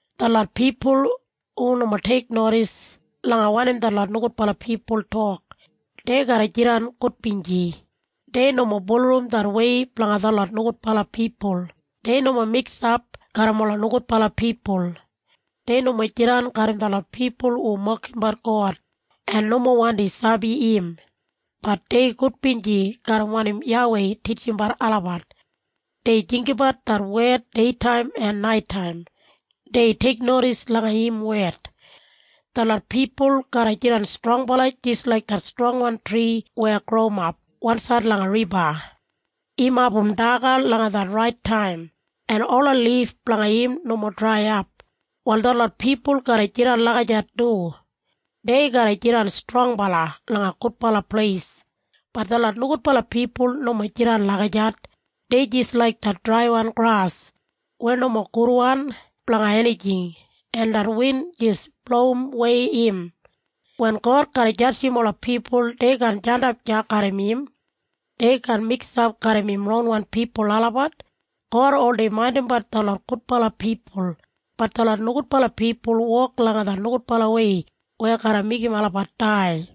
23Detlot pipul hu nomo teiknodis langa wanim detlot nogudbala pipul tok, dei garra jidan gudbinji. Dei nomo bulurrum det wei blanga detlot nogudbala pipul. Dei nomo miksap garram ola nogudbala pipul. Dei nomo jidan garram detlot pipul hu mokimbat God, en nomo wandi sabi im. Bat dei gudbinji garram wanim YAWEI titjimbat olabat. Dei jinggabat det wed deitaim en naitaim. Dei teiknodis langa im wed. Detlot pipul garra jidan strongbala jis laik det strongwan tri weya growimap wansaid langa riba. Im abum daga langa det rait taim, en ola lif blanga im nomo draiyap. Wal ol detlot pipul garra jidan lagijat du. Dei garra jidan strongbala langa gudbala pleis. Bat detlot nogudbala pipul nomo jidan lagijat. Dei jis laik det draiwan gras, weya nomo gudwan blanga enijing, en det win jis blowimwei im. Wen God garra jadjim ola pipul dei kaan jandap deya garram im. Dei kaan miksap garram im ronwan pipul olabat. God oldei maindimbat detlot gudbala pipul, bat detlot nogudbala pipul wok langa det nogudbalawei weya garra meigim olabat dai.